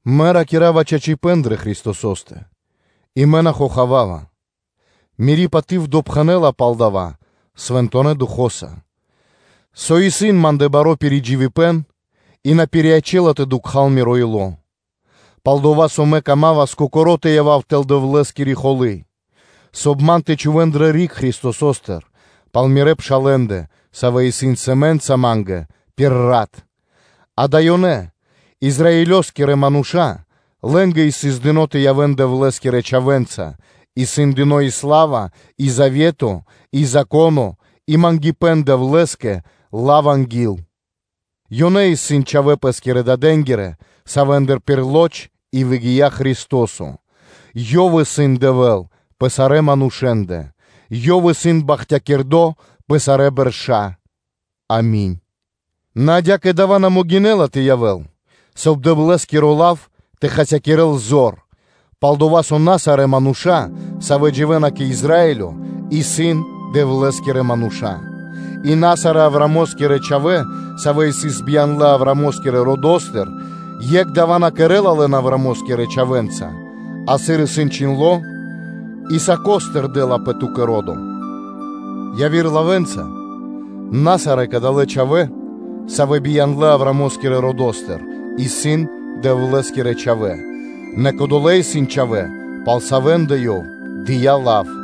Мэ ракира́ва чачипэ́н дрэ Христосо́стэ и мэ на хохавава, мири́ паты́в допхэнэ́ла пал дава́ Свэнтонэ́ Духо́са; со исын ма́ндэ баро́ пиридживибэн, и на пириячэ́ла тэ дукхал миро ило́; пал-дова́ со мэ камамас кокоро́ тэ явав тэл Дэвлэ́скири прокошыбэна (арманя́), соб (кай) ман тэ чхувэ́н дрэ риг Христосостыр пал мирэ́ пшалэ́ндэ, савэ́ исын сэмэ́нца ма́нгэ пир рат; ґа́да, ёнэ исын Израилёскирэ мануша́, лэ́нгэ сыс дыно́ тэ ячэн Дэвлэ́скирэ чхавэ́нца тэ прилэ́н миштыпэ́н, исын дыно́ и сла́ва и завето, и Зако́но тэ прилэ́н, и мангипэ́н Дэвлэ́скэ, и лав анги́л; ёнэ исын чхавэ́ пэ́скирэ дадэнги́рэ, савэ́ндыр пир лоч и выгия́ Христо́со, Ёв исын Дэвэ́л пэ сарэ́ манушэ́ндэ, Ёв исын бахтякирдо́ пэ сарэ́ бэрша́. Ами́нь. Нэ адя́кэ дава́ на могинэ́ла тэ явэ́л, соб (кай) Дэвлэ́скиро лав тэ хасякирэ́л зор; пал-дова́ со на сарэ́ мануша́, савэ́ дживэ́на кэ Израилё, исын Дэвлэ́скирэ мануша́; и на сарэ́ Авраамо́скирэ чхавэ́, савэ́ исын бияндлэ Авраамо́скирэ родо́стыр, екх дава́ на кэрэ́ла лэн Авраамо́скирэ чхавэ́нца; а сыр исын чхиндло́: “Исаакостыр дэ́лапэ ту́кэ ро́до!” Явирэ лавэ́нца, на сарэ́ кадалэ́ чхавэ́, савэ́ бияндлэ Авраамо́скирэ родо́стыр, исын Дэвлэ́скирэ чхавэ́: нэ кодолэ́ исын чхавэ́, пал савэ́ндэ Ёв дыя́ лав.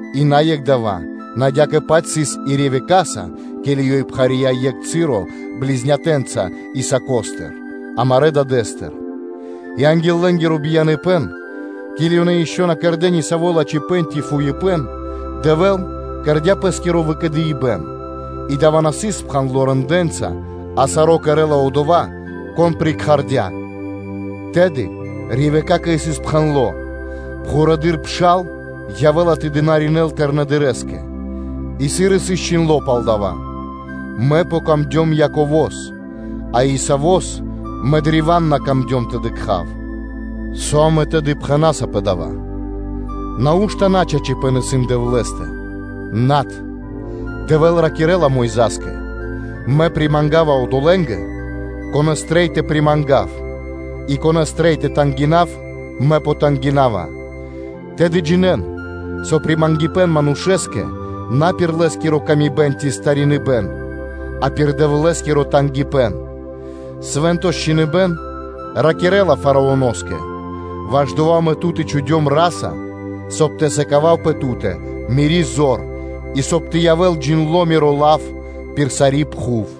И на екх дава́; нэ адя́кэ-паць сыс и Ревекаса, ке́ли ёй пхария дро екх часо близнятэнца Исаакостыр, амарэ́ дадэ́стыр, и анги́л лэ́нгиро бияныпэ́н, ке́ли ёнэ ишчо (инкэ́) на кэрдэ́ нисаво́ лачхипэ́н ци фуипэ́н, Дэвэ́л кэрдя́ пэ́скиро выкэдыибэн, и дава́ на сыс спхандло рэндэ́нца, а саро́ кэрэ́ла Одова́, Кон прикхардя, тэды Ревекакэ сыс пхэндло́: “Пхурэды́р пшал явэ́ла тэ дынаринэ́л тыкнэдырэскэ”: и, сыр исын чхиндло́ пал дава́: “Ма́нгэ яця́ дро́го Яково, а Исавос Мэ древа́н на камдём тэ дыкха́в.” Со амэ тэды пхэна́са пэ дава́? Нау́што начачипэ́н исын Дэвлэ́стэ? Над. Дэвэ́л ракирэ́ла Мойза́скэ: “Мэ примангава одолэ́нгэ, конэ́с трэй тэ примангав, и конэ́с трэй тэ тангинав, Мэ потангинава.” Тэды джинэ́н, со примангипэн манушэ́скэ на пир лэ́скиро ило́ ци стариныбэн, а пир Дэвлэ́скиро тангипэ́н. Свэ́нто ж Чхиныбэ́н ракирэ́ла Фараоно́скэ: “Ваш дова́ Мэ тут и чхудём ра́са, соб (кай) тэ сыкавав пэ ту́тэ Мири́ зор, и соб (кай) тэ явэ́л джиндло́ Миро лав пир сари́ пхув.”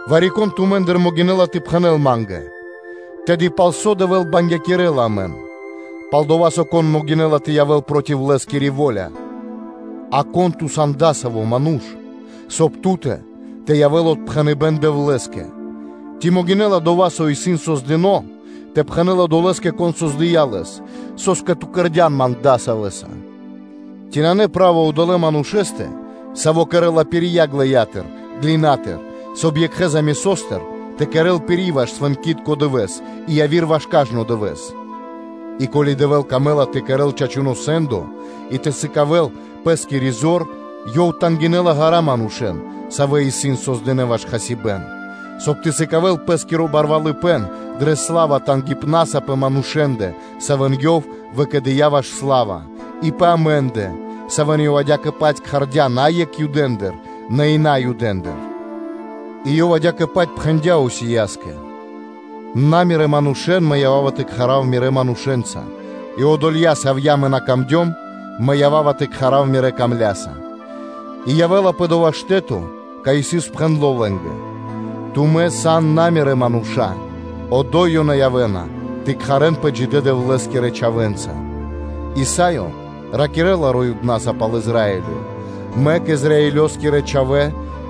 Вари-кон тумэ́ндыр могинэ́ла тэ пхэнэ́л ма́нгэ тэды: “Пал со, Дэвэ́л бангякирэла амэн? Пал-дова́ со, кон могинэ́ла тэ явэ́л проти Лэ́скири во́ля?” А кон ту сан адасаво́ ману́ш? Соб (кай) ту́тэ тэ явэ́л отпхэныбэ́н Дэвлэ́скэ? Ци могинэ́ла дова́, со исын кэрдо́, тэ пхэнэ́л одолэ́скэ, кон кэрдя́ лэс: “Со́скэ ту кэрдя́н ман дасавэса?” Ци нанэ право одолэ́ манушэ́стэ, саво́ кэрэ́ла пирья ґлэя́тыр (глина́тыр), соб (кай) екхэ замесостыр тэ кэрэ́л пири́ ваш свэнкитко дывэ́с, и яви́р ваш кажно дывэ́с? И ко́ли Дэвэ́л камэ́ла тэ кэрэ́л чачуно́ сэ́ндо и тэ сыкавэ́л Пэ́скири зор, Ёв тангинэла ґара́ манушэ́н, савэ́ исын создынэ ваш хасибэ́н; соб (кай) ты сыкавэ́л Пэ́скиро барвалыпэ́н дрэ сла́ва тангипнаса пэ манушэ́ндэ, савэ́н Ёв выкэдыя́ ваш сла́ва, и пэ амэ́ндэ, савэ́н Ёв адя́кэ-паць кхардя́ на екхэ Юдэндыр, нэ и Наюдэндыр? И Ёв адя́кэ-паць пхэндя́ Осияскэ: “На Мирэ́ манушэ́н Мэ ява́ва тэ кхарав Мирэ́ манушэ́нца, и одолья, савья́ Мэ на покэрдём (сави́ на яця́ пир ило́ Ма́нгэ), Мэ ява́ва тэ кхарав ‘мирэ́ дрогонаса.’ И явэ́ла пэ дова́ штэ́то, кай сыс пхэндло́ лэ́нгэ: ‘Тумэ́ сан на Мирэ́ мануша́, одо́й ёнэ явэ́на тэ кхарэнпэ джидэ́ Дэвлэ́скирэ чхавэ́нца.’” Исаё ракирэ́ла роибнаса пал Израилё: “Мэк Израилёскирэ чхавэ́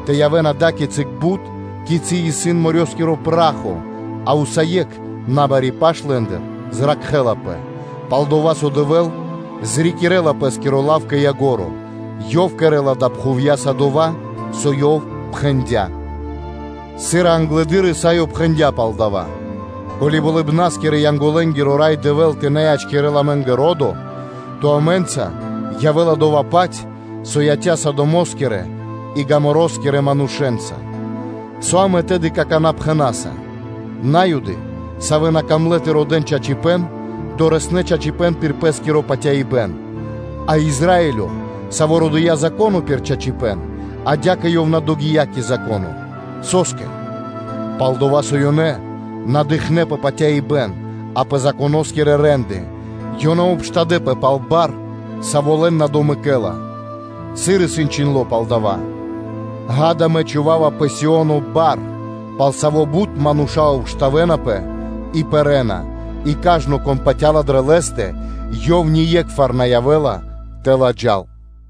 тэ явэ́н ада́кицы бут, кицы́ исын морёскиро (дэрьявэ́скиро) пра́хо, а усае́кх набари паш лэ́ндыр зракхэ́лапэ: пал-дова́ со Дэвэ́л зрикирэла Пэ́скиро лав кэ ко́нцо (кэ яго́ро); Ёв кэрэ́ла далэ́ пхувья́са дова́, со Ёв пхэндя́.” Сыр и англэды́р Исаё пхэндя́ пал дава́: “Ко́ли болыбна́скирэ-янголэ́нгиро Рай Дэвэ́л тэ на ячкирэл амэ́нгэ ро́до, то амэ́нца явэ́ла дова́-паць, со яця́ Содомо́скирэ и Гоморакирэ манушэ́нца.” Со амэ тэды какана́ пхэна́са? На́юды, савэ́ на камлэ́ тэ родэ́н чачипэ́н, дорэснэ́ (долынэ) чачипэ́н пир пэ́скиро патяибэ́н. А Израилё, саво́ родыя Зако́но пир чачипэ́н, адя́кэ ёв на догия́ кэ Зако́но. Со́скэ? Палдова́ со ёнэ на дыкхнэ́ пэ патяибэ́н, а пэ Законо́скирэ рэ́нды. Ёнэ обштадэпэ пал бар, саво́ лэн на домэкэла, сыр и исын чхиндло́ пал дава́: “Ѓа́да, Мэ чхува́ва пэ Сио́но бар, пал саво́ бут мануша́ обштавэнапэ и пэрэ́на: и кажно, кон патя́ла дрэ Лэ́стэ, одова́ ние́кхвар на явэ́ла тэ ладжал.”